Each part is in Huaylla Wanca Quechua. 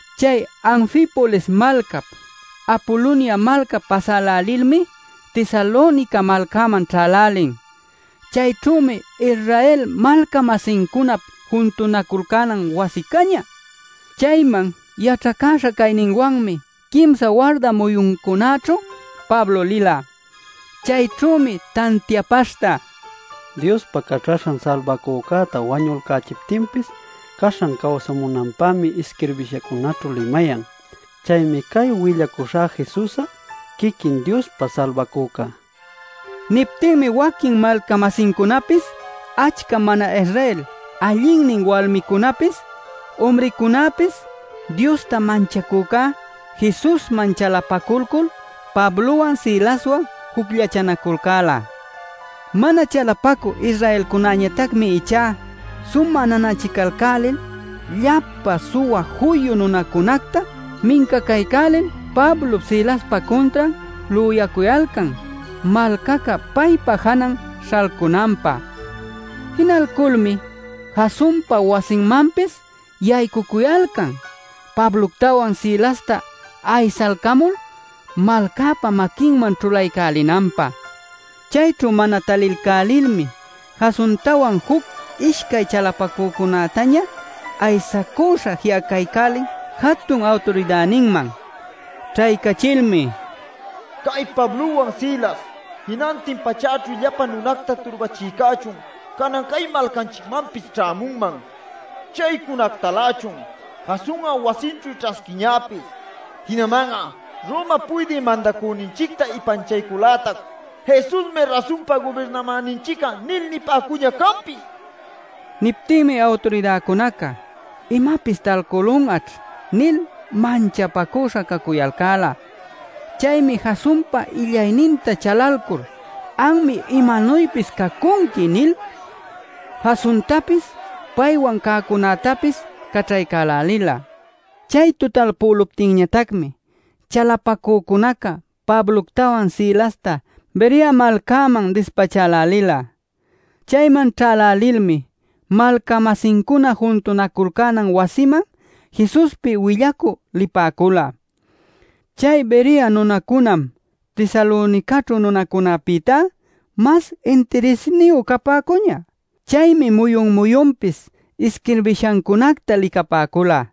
Chay Anfipolis malcap, Apolonia malcap pasälälilmi Tesalonica malcäman ćhälälin. Chayćhümi Israel malca-masincunap juntunaculcänan wasi cañä. Chayman yaćhacäśha cayninwanmi quimsa warda muyuncunäćhu Pablo lila. Chayćhümi tantiapaśhta: “Diospa Caćhaśhan Salbacücäta wañulcachiptinpis caśhan cawsamunanpämi isquirbishancunaćhu limayan. Chaymi cay willacuśhä Jesus'a quiquin Diospa Salbacüca” nila. Niptinmi waquin malca-masincunapis achca mana-Israel allinnin walmicunapis, umricunapis Diosta manchacücá Jesusman chalapaculcul, Pablowan Silaswan jucllachanaculcäla. Mana chalapacü Israelcunäñatacmi ichá sumä nanachicalcälil llapa suwa juyu nunacunacta mincacaycälil Pablop Silaspa cuntran lüyacuyalcan malcaca paypa janan śhalcunanpä. Jinalculmi Jasonpa wasinmanpis yaycucuyalcan Pabloctawan Silasta aysalcamul malcäpa maquinman ćhulaycälinanpä. Chayćhu mana talilcälilmi Jasontawan juc ishcay chalapacücunätaña aysacuśha ji'acaycälin jatun awturidäninman. Ćhaycachilmi: “Cay Pablowan Silas, jinantin pachäćhu llapa nunacta turbachïcächun, canan cay malcanchicmanpis ćhämunman. Chaycunactalächun Jason'a wasinćhu ćhasquiñäpis. Jinaman'a Romap Puydï Mandacüninchicta ipanchaycul-lätac ‘Jesusmi rasunpa gubirnamäninchic'a’ nil nipäcuñä canpis” nicuyalcan. Niptinmi awturidäcunaca “Imapis talcülun'aćh” nil manchapacüśha cacuyalcäla. Chaymi Jasonpa illayninta chalalcul “Anmi imanuypis cacunqui” nil Jasontapis paywan cäcunätapis caćhaycälila. Chay tutalpüluptinñatacmi chalapacücunaca Pabloctawan Silasta Berea malcäman dispachälälila. Chayman ćhälälilmi, malca-masincuna juntunaculcänan wasiman Jesuspi willacü lipäcula. Chay Berea nunacunam Tesalonicaćhu nunacunäpïtá mas intirisniyu capäcuñä. Chaymi muyun-muyunpis isquirbishacunacta licapäcula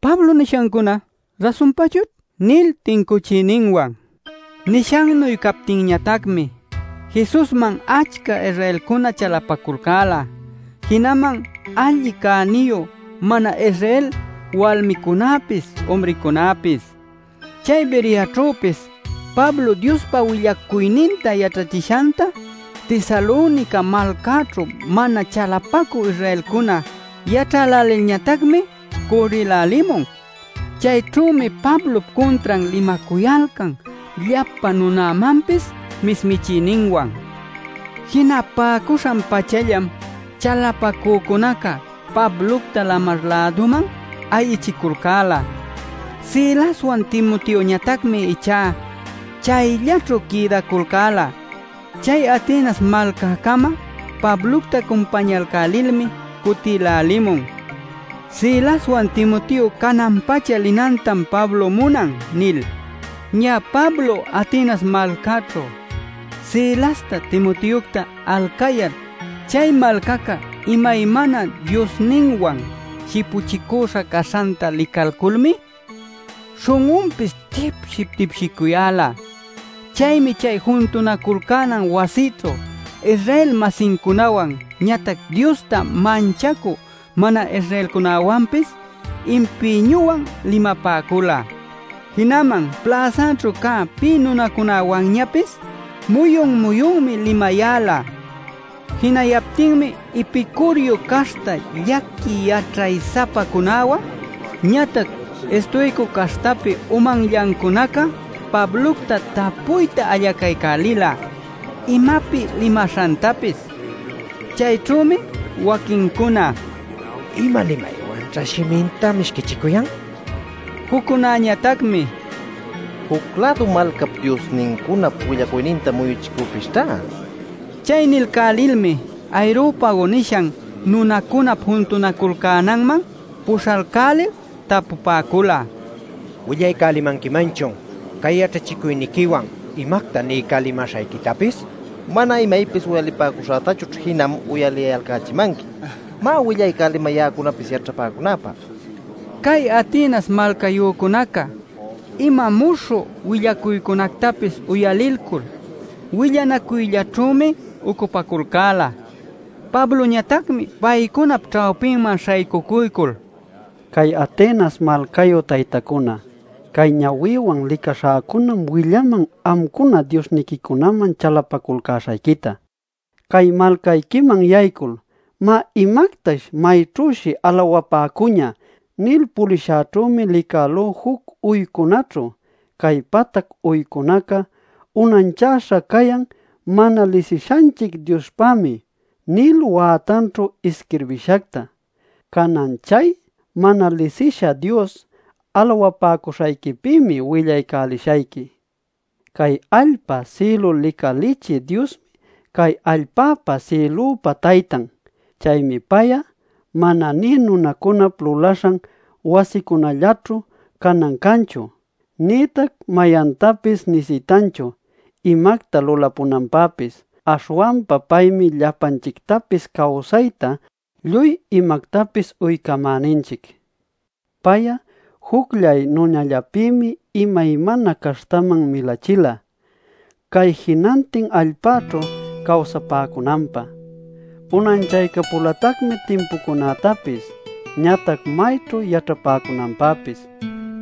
“Pablo nishancuna rasunpachućh” nil tincuchiyninwan. Nishannuy captinñatacmi Jesusman achca Israelcuna chalapaculcäla jinaman allin cäniyu mana-Israel walmicunapis umricunapis. Chay Bereaćhüpis Pablo Diospa willacuyninta yaćhachishanta Tesalonica malcaćhu mana chalapacü Israelcuna yaćhälälilñatacmi cürrïlälimun. Chayćhümi Pablop cuntran limacuyalcan llapa nunamanpis mismichiyninwan. Jinapacüśhan-pachallam chalapacücunaca Pablocta lamar-läduman ayichiculcäla. Silaswan Timoteoñatacmi ichá chayllaćhu quïdaculcäla. Chay Atenas malcäcama Pablocta cumpañalcälilmi cutïlälimun “Silaswan Timoteo canan-pacha linanta Pablom munan” nil. Ñä Pablo Atenas malcäćhu Silasta Timoteocta alcayal chay malcaca imaymana diosninwan shipuchicüśha caśhanta licalculmi śhun'unpis tipship-tipshicuyäla. Chaymi chay juntunaculcänan wasićhu Israel-masincunawan ñatac Diosta manchacü mana-Israelcunäwanpis impïñuwan limapäcula. Jinaman pläsaćhu cä pï nunacunawanñapis muyun-muyunmi limayäla. Jinayaptinmi Epicuriu caśhta llaqui yaćhay-sapacunawan, ñatac Estoico caśhtapi umanllancunaca Pablocta tapuyta allacaycälila imapi limaśhantapis. Chayćhümi waquincuna: “¿Ima limaywanćha shiminta mishquichicuyan?” nipäcula. Juccunäñatacmi: “Juc-lädu malcap diosnincunap willacuyninta muyuchicüpisćhá” nipäcula. Chay nilcälilmi Areopago nishan nunacunap juntunaculcänanman puśhalcälil tapupäcula: “¿Willaycälimanquimanchun cay yaćhachicuyniquiwan imacta niycälimäśhayquitapis? Mana imaypis uyalipäcuśhätachućh jinam uyaliyalcächimanqui. Má, willaycälimay ya'acunapis yaćhapäcunäpä” nil. (Cay Atenas malcayücunacá ima muśhü willacuycunactapis uyalilcul, willanacuyllaćhümi ucupaculcäla.) Pabloñatacmi paycunap ćhawpinman śhaycucuycul: “Cay Atenas malcayu taytacuna, cay ñawïwan licaśhäcunam willaman amcuna diosniquicunaman chalapaculcäśhayquita. Cay malcayquiman yaycul ‘Má, imactash mayćhüshi alawapäcuñä’ nil pulishäćhümi licälú juc uycunaćhu ‘Cay patac uycunacá unanchäśha cayan Mana Lisishanchic Diospämi’ nil wätanćhu isquirbïshacta. Canan chay ‘Mana Lisisha Dios’ alawapäcuśhayquipïmi willaycälishayqui. “Cay allpa sïlu licalichï Diosmi cay allpäpa sïlüpa Taytan. Chaymi pay'a mana nï nunacunap lulaśhan wasicunallaćhu canan canchu, nïtac mayantapis nisitanchu imacta lulapunanpäpis. Aśhwanpa paymi llapanchictapis cawsayta, lluy imactapis uycamäninchic. “Pay'a jucllay nunallapïmi imaymana caśhtaman milachila, cay jinantin allpäćhu cawsapäcunanpä. Unanchaycapulatacmi timpucunätapis ñatac mayćhu yaćhapäcunanpäpis.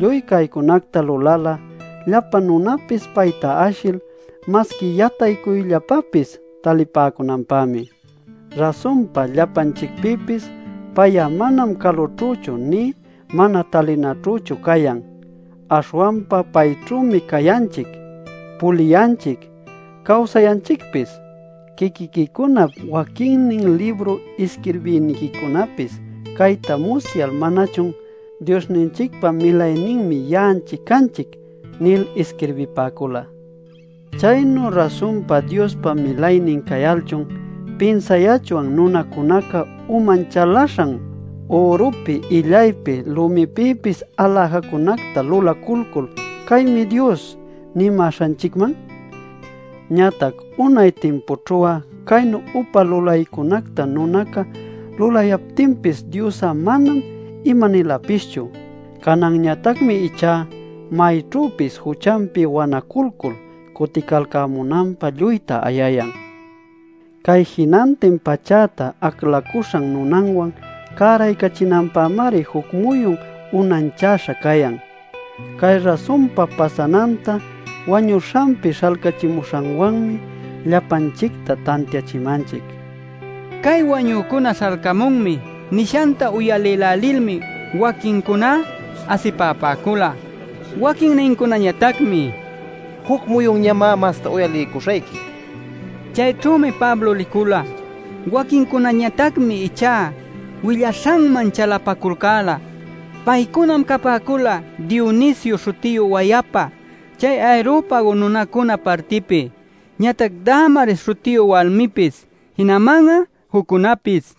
Lluy caycunacta lulala llapa nunapis payta ashil masqui yataycuyllapapis talipäcunanpämi. Rasunpa llapanchicpïpis pay'a manam calućhüchu nï mana talinaćhüchu cayan. Aśhwanpa payćhümi cayanchic, puliyanchic, cawsayanchicpis. Quiquiquicunap waquinnin libru isquirbïniquicunapis cayta musyal ¿manachun ‘Diosninchicpa milayninmi ya'anchic canchic’ nil isquirbipäcula? “¿Chaynu rasunpa Diospa milaynin cayalchun, pinsayachwan nunacunca uman chalaśhan ürupi illaypi lumipïpis aläjacunacta lulaculcul ‘Caymi dios’ nimäśhanchicman? Ñatac unay timpućhu'a caynu upa lulaycunacta nunaca lulayaptinpis Dios'a manam imanilapischu. Cananñatacmi ichá mayćhüpis juchanpi wanaculcul cuticalcämunanpä lluyta ayayan. Cay jinantin pachäta aclacuśhan nunanwan cäraycachinanpämari juc muyun unanchäśha cayan. Cay rasunpa pasananta wañuśhanpi śhalcachimuśhanwanmi llapanchicta tantiachimanchic” nila. Cay “Wañücuna śhalcamunmi” nishanta uyalïlälilmi waquinnincuná asipapäcula. Waquinnincunañatacmi: “Juc muyunñamá masta uyaliycuśhayqui” nipäcula. Chayćhümi Pablo licula. Waquinnincunañatacmi ichá willaśhanman chalapaculcäla. Paycunam capäcula Dionisio śhutiyu wayapa chay Areopago nunacuna partipi, ñatac Damaris śhutiyu walmipis, jinaman juccunapis.